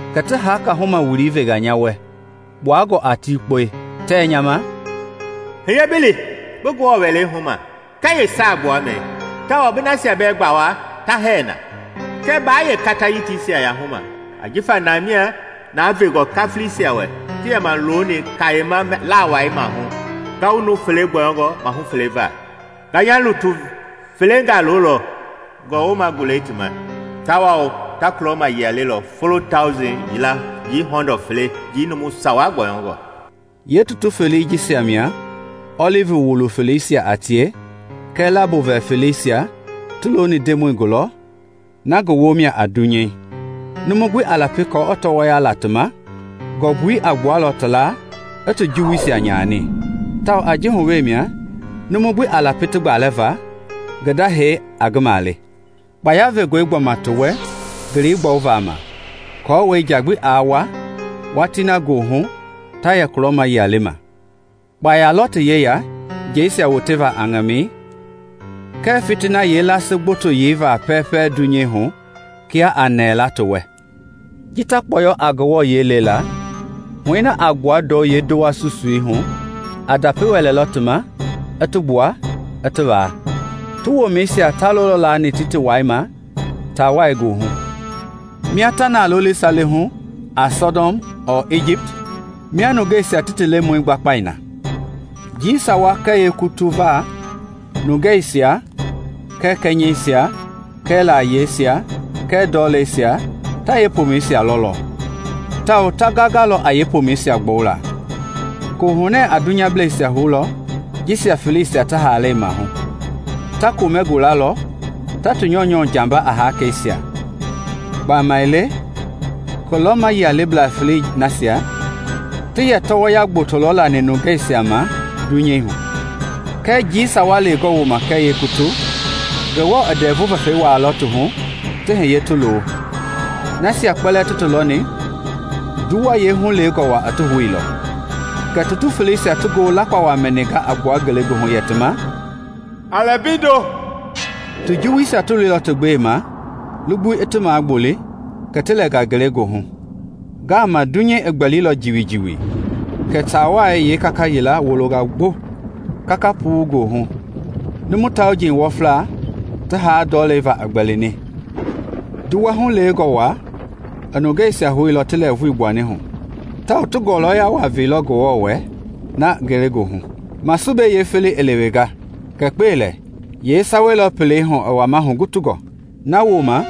Kɛ ti haka huma wului venga nya wɛ, kpuangɔ a tikpɔi, tɛ nya ma, “Hiye bi li bi Ngewɔ wɛlei huma kɛɛ yeesaagbuamɛi, tawao bi nasia bɛɛ gbawa ta hɛɛ na. Kɛɛ baa yeekata yitisia yahuma ajifa na mia na vengɔ kafilisia wɛ ti yɛma looni kayema laawai maahu ngawu nuu fele gbɔyɔngɔ mahu fele va. Nga nya lutu felengaa loolɔ ngɔwoma gulɛi ti ma, tawao ta kulɔma yia lelɔ folo tauji yila njii hɔndɔ fele njii nuu sawa gbɔyɔngɔ.” Yeetutu felei jisia mia ɔlivi wului feleisia a tie kɛɛ lambo vɛ feleisia ti looni Ndemɔi gulɔ na ngi womia a dunyei. Numu gbi a lapi kɔɔ i tɔɔya la ti ma, ngɔmbui a gbualɔ ti laa i ti juwuisia nyani; tawao a ji hu we mia numu gbi a lapi ti gbalɛ va ngi da hee a ngi male. Kpaya vengɔe gbɔma ti wɛ ngelei gbɔwu va ma aako nja gbi aa wua watii na goohu ta yɛ kulɔma yia le ma. Kpaya lɔ ti yeya njeisia woteva a ŋamɛi kɛɛ fitini yeelasii gboto yeiva pɛpɛɛ dunyei hu kia a nɛɛla ti wɛ. Ji ta kpɔyɔ a Ngewɔ yie le la, huɛi na a gbua ndɔu yeendowa susuihu a ndapi wɛlɛlɔ ti ma, i ti gbua i ti waa. Ti womɛisia ta lolɔ laani tiitiwai ma taawai goohu, mia ta na loli sale hu a Sɔdɔm ɔɔ Ijipt, mia nungeisia ti ti Lemɔi gbakpai na. Njii sawa kɛɛ yeekutu va, nungɛisia, kɛɛ kɛnyɛisia, kɛɛ layiesia, kɛɛ ndɔleisia ta yeepomɛisia lɔlɔ, tawao ta gangalɔ a yeepoomɛisia gbɔwula. Koohunɛ a dunyableisia houlɔ jisia feleisia ti haalɛi maahu. Ta komɛ gulalɔ ta ti nyɔunyɔ jamba a hakeisia, gbamaile kulɔma yialeblaa felei nasia ti yɛ tɔɔya gboto lɔ lani nungeisia ma ti dunyei hu. Kɛɛ njii sawa lewengɔ woma kɛɛ yeekutu, Ngewɔ i ndɛvu vɛfɛi wuailɔ ti hu ti hiye ti loo; nasia kpɛlɛɛ ti ti lɔni nduwɛi yeehulewengɔ wa ti houilɔ. Kɛ tutu feleisia ti ngoo lakpawa mɛninga a gbua ngelegoohu yɛ ti ma, “A lɛ mbeindo!” Ti juwuisia ti loilɔ ti gbema lugbui i ti magboli kɛ ti lɛnga ngelegoohu. Ngaama dunyei gbɛlilɔ jiwijiwi kɛ taawai yeekaka yila wolonga gbo kaka puu goohu, numu tauji wɔfla ti haa ndɔlei va i gbɛlini. Nduwa hulewengɔ wa i nungeisia houilɔ ti lɛɛvui gbuani hu, tawao ti ngɔlɔya waa veilɔ Ngewɔ wɛ na ngelegoohu. Masube yeefelei i lewenga; kɛɛ kpelɛ na! Yeesawei lɔ pelei hu wama hugutungɔ. Nawooma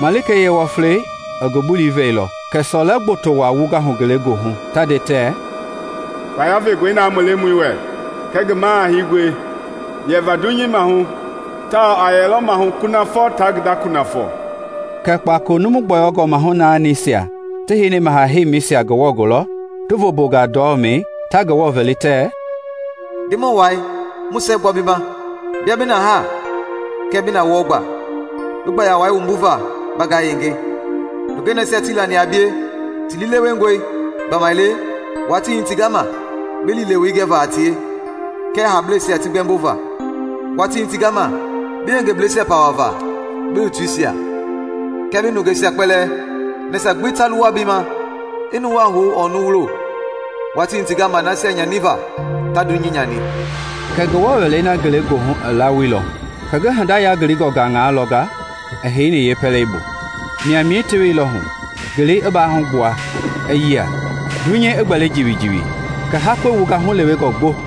malikei yeewɔflei i ngi bulii vɛilɔ kɛ sɔlɛ gboto wa i wungahu ngelegoohu, ta nde tɛ, “Kpaya vengɔi na mu Lemɔi wɛ kɛɛ ngi Maha Hengɔi yɛva dunyei maahu, tawao a yɛlɔ maahu kunafɔ taa ngi nda kunafɔ.” Kɛ kpakolo nuu gbɔyɔngɔ mahu naanisia ti heini ti heimisia Ngewɔ gulɔ ti vombonga ndɔmɛi ta Ngewɔ vɛli, tɛ: “Ndemɔi Wai, mu siɛgbua bi ma, bia bi na haa kɛɛ bi na wɔɔ gbaa, bi gbaya wai wumbuva ba ngayenge! Nungɛi nasia tii lani a bie ti liilewengɔi; gbamaile watii hitinga ma bi liilewei gɛva a tie, kɛɛ haableisia ti gbɛmbova. Watii hitinga ma bi yengebleisia pawa va, bi lutuisia, kɛɛ bi nungeisia kpɛlɛɛ, nasia gbi ta luwa bi ma, i nuwaa hu ɔɔ nuwulo. Watii hitinga ma nasia nyani va ta dunyei nyani!” Ngewɔ wɛlei na ngelegoohu i lawoilɔ, kɛ ngi hinda yangilingɔ gaŋaa lɔnga i heini yeepɛleibu. Maimai teweilɔ hu, ngelei i baahugbua a yia, dunyei a gbɛli jiwijiwi, kɛ hakɔi wunga hulewengɔ gboŋ.